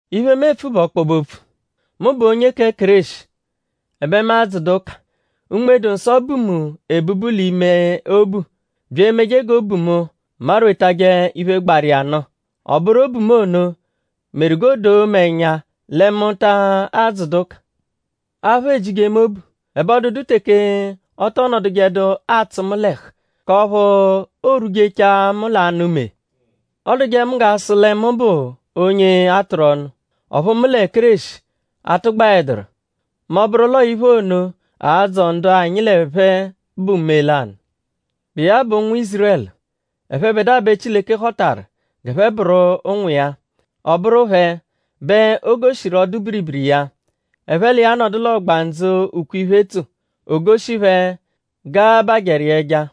Iphe, mu epfu bụ ọkpobe-opfu. Mu bụ onye kẹ Kéreshi; ẹbe mu adzụdu ụka. Unme-dụ-Nsọ bu mu ebubu l'ime obu bya emeje g'obu mu marwetajẹ iphe, gbaru iya nụ. Ọ bụru obu mu ono meru g'o doo mu ẹnya lẹ mu ta adzụdu ụka. Aphụ ejije mu obu. Ẹbe ọ dụdu teke ọ tọ nọdujedu atsụ mu l'ẹhu; k'ọphu oorwujechaa mu l'anụ mee Ọoduje mu g'a sụ lẹ mu bụ onye a tụru ọnu; ọphu mu lẹ Kéreshi atụgbaeduru; mẹ ọ -bụru l'ọo iphe ono a-dzọ ndu anyi lẹ phẹ bụ mee lanụ; bụ iya bụ ụnwu Ízurẹlu. Ẹphebedua bẹ Chileke họtaru g'ẹphe bụru ụnwu iya. Ọ bụru phẹ bẹ o goshiru ọdu-biribiri iya; ẹphe l'iya nọdu l'ọgbandzu, ukwe-iphe tso. O goshi phẹ g'a-abajẹru iya ẹja.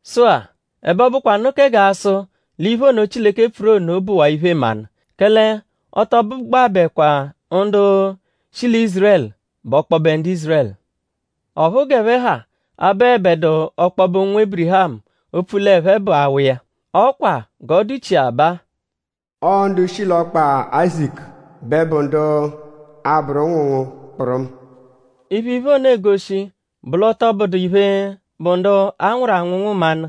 Sụ-a; ẹbe ọ bụkwanu kẹ g'a sụ l'iphe ono, Chileke pfuru ono bụwaa iphe-mmanụ; kẹle ọ tọ bụgbabekwa ndu shi lẹ Ízurẹlu bụ ọkpobe ndu Ízurẹlu. Ọphu g'ẹphe ha abụebedu ọkpobe ụnwu Ébirihamu opfu l'ẹphe bụ awa iya. Ọ kwa g'ọ dụchia baa: “Ọo ndu shi l'ọkpa Áyizaku bẹ bụ ndu a-bụru ụnwu ngu kpụrumu.” Iphe, iphe ono egoshi bụ l'ọ tọ bụdu iphe, bụ ndu a nwụru anwụnwu mmanụ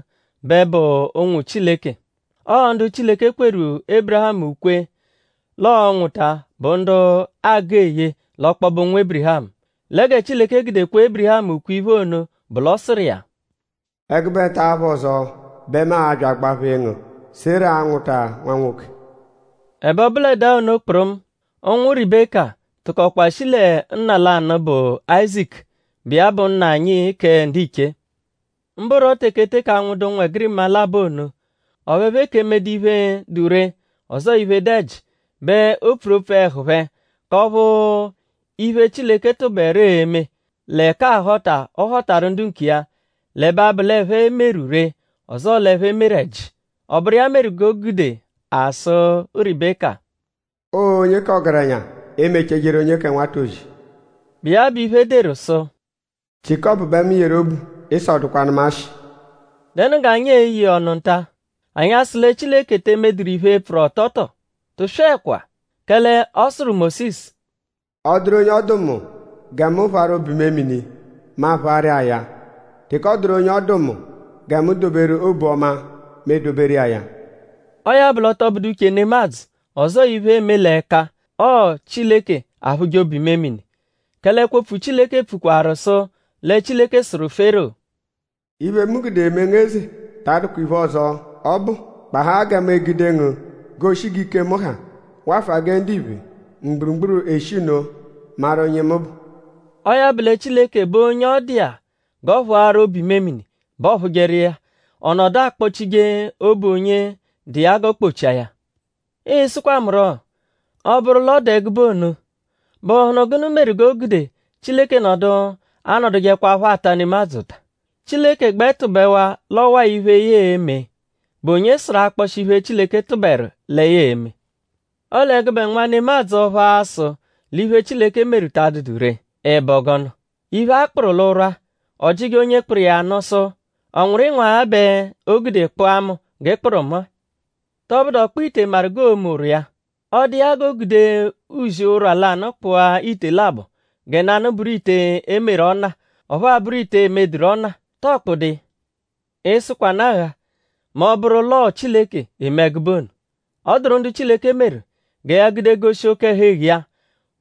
bẹ bụ ụnwu Chileke. Ọo ndu Chileke kweru Ébirihamu ukwe l'ọo-nwụta bụ ndu aagụ eye l'ọkpobe ụnwu Ébirihamu. Lẹ gẹ Chileke gude kwe Ébirihamu ukwe-iphe ono bụ l'ọ sụru iya: “Ẹgube nta apha ọzo bẹ mu a-bya agbaphee ngu; Sera anwụta nwa nwoke.” Ẹbe ọ bụledaa ono kpụrumu; ụnwu Ribeka tụkokwa shi lẹ nna lanụ, bụ Áyizaku, bụ iya bụ nna anyi kẹ ndiche. Mbụro teke eteke anwụdu ụnwegirima labọ ono; ọphu ẹphe eke emedu iphe, dụ ree; ọzoo iphe, dụ ẹji bẹ o pfuru opfu ẹhu phẹ; k'ọphu iphe, Chileke tụberu e-me; lẹ k'ahọta, ọ họtaru ndu nkiya, l'ẹbe abụ l'ẹphe meru ree; ọzoo l'ẹphe meru ẹji. Ọ bụru iya meru g'o gude a sụ Ribeka: “Ọo onye k'ọgerenya e-mechaa ejeru onye kẹ nwata ozi.” Bụ iya bụ iphe, e deru sụ: “Jiékọpu bẹ mu yeru obu; Ịso dụkwanu mu ashị.” ?Dẹnu g'anyi e-ye iya ọnu nta??Anyi a-sụ lẹ Chileke te emeduru iphe, pfụru ọto tọo? Tụswekwa! Kẹle ọ sụru Mósisu: “Ọ -dụru onye ọ dụ mu gẹ mu phụaru obu-imemini; mu aphụaru iya ya. Teke ọ dụru onye ọ dụ mu gẹ mu doberu obu-ọma; mu edoberu iya ya.” Ọo ya bụ l'ọ tọ bụdu uche nemadzụ; ọzoo iphe, eeme l'ẹka; ọo Chileke aphụje obu-imemini. Kẹle ẹkwo-opfu Chileke pfukwaru sụ lẹ Chileke sụru Fero: “Iphe, mu gude mee ngu eze ta adụkwa iphe ọzo, ọ bụ; gbahaa gẹ mu egude ngu goshi g'ike mu ha; wafụa gẹ ndiphe mgburugburu eshi nno maru onye mu bụ.” Ọo ya bụ lẹ Chileke bụ onye ọ dụ iya g'ọ phụaru obu-imemini bẹ ọ phụjeru iya; ọ nọdu akpọ-chije obu onye dụ iya g'ọ kpọ-chia ya. Ịi-sụkwa mu rọ: Ọ -bụru l'ọ dụ ẹgube ono?bụhunu gụnu meru g'o gude Chileke nọdu anọdujekwapho ata nemadzụ ụta? Chileke -gbẹ tụbewaa l'ọo ọwa-a iphe, ya e-me;?bụ onye sụru akpọshi iphe, Chileke tụberu lẹ ya e-me? Ọle gụbe nwa nemadzụ ọphu a-sụ l'iphe, Chileke meru ta adụdu ree;?Ị bụ gụnu??Iphe, a kpụru l'ụrwa, ọojije onye kpụru iya nụ sụ: “?Ọ nwụru ịnwagha bẹ o gude ị kpụa mu g'ị kpụru mu-a?” ?Tọbudu ọ-kpụ-ite maru g'oo-me ụrwa iya? Ọ -dụ iya g'o gude uzi ụrwa lanụ kpụa ite labọ gẹ nanụ bụru ite, e meru ọna; ọphuu abụru ite, e medụru ọna;?tọo kpụdu iya? ?Ịi-sụkwanu agha mẹ ọ -bụru l'ọo Chileke eme ẹgube ono? Ọ dụru ndu Chileke meru gẹ ya gude goshi oke-ẹhu-eghu iya;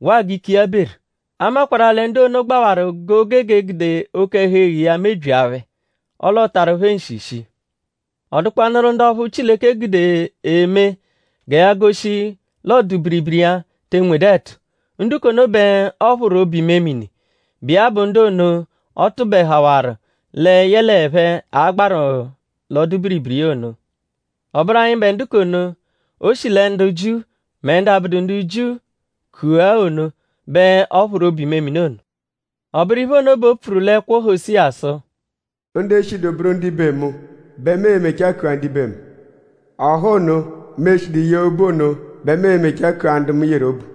waa g'ike iya beru. A makwarụ-a lẹ ndu ono gbawaru g'o gege egude oke-ẹhu-eghu iya mebyia phẹ; ọle ọotaru phẹ nshi shii. Ọ dụkwanuru ndu ọphu Chileke gude eme gẹ ya goshi l'ọdu-biribiri iya te nwedu ẹtu. Ndu k'ono bẹ ọ phụru obu-imemini, bụ iya bụ ndu ono, ọ tụbehawaru lẹ yẹle ẹphe a-gbaru l'ọdu-biribiri iya ono. Ọ bụru anyịbe ndu k'ono, o shi lẹ ndu Jiu mẹ ndu abụdu ndu Jiu kua ono bẹ ọ phụru obu-imemini ono. Ọ bụru iphe ono bẹ o pfuru l'ẹkwo Hosiya sụ: “Ndu eshidu bụru ndibe mu bẹ mu e-mechaa kua ndibe mu. Ọha ono, mu eshidu yee obu ono bẹ mu e-mechaa kua ndu mu yeru obu.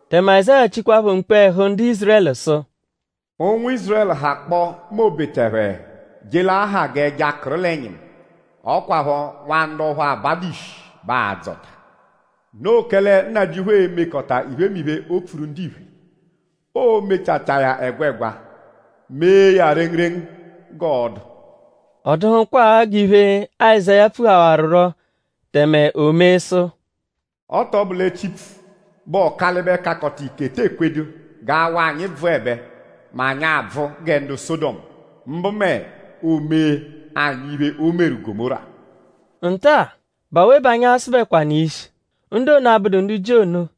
Tẹme Azáya chikwaaphọ mkpu ẹhu ndu Ízurẹlu sụ: “Ụnwu Ízurẹlu -hakpọo mẹ obeta ẹphe je l'aha g'ẹja, kụru l'ẹnyimu; ọ kwaphọ nwa ndu ọphu abadu ishi bẹ aa-dzọta. Noo kẹle Nnajịuphu e-mekọta iphemiphe, o pfuru ndiphe. Oo-mechachaa ya ẹgwegwa; mee ya rengurengu g'ọo-dụ.” Ọ dụhukwaa g'iphe, Azáya pfuhawarurọ tẹme o mee sụ: “Ọ tọ bụ lẹ Chipfu, bụ Ọkalibe-Kakọta-Ike te ekwedu g'awa anyi bvụebe mẹ anyi abvụ gẹ Sọdomu; mbụ mẹ o mee anyi iphe, o meru Gọmóra.” Nta-a?bụ awe bẹ anyi a-sụbekwanu iya ishi? Ndu ono, abụdu ndu Jiu ono,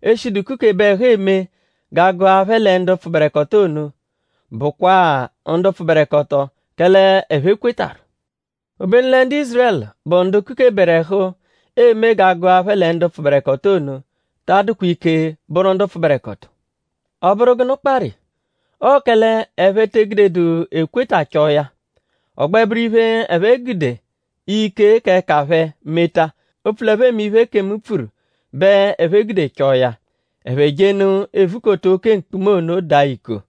eshidu kukebe ẹhu eme g'a gụa phẹ lẹ ndu pfụberekoto ono; bụakwaa ndu pfụberekoto; kẹle ẹphe kwetarụ. Obenu lẹ ndu Ízurẹlu, bụ ndu kukeberu ẹhu eme g'a gụa phẹ lẹ ndu pfụberekoto ono; ta adụkwa ike bụru ndu pfụberekoto. ?Ọ bụru gụnu kparụ iya? Ọo kẹle ẹphe te egudedu ekweta chọo ya; ọ gbẹ bụru iphe, ẹphe gude ike k'ẹka phẹ meta; opfu l'ẹphe eme iphe, ekemu pfuru bẹ ẹphe gude chọo ya. Ẹphe jenụ evukota oke mkpuma ono daa iko.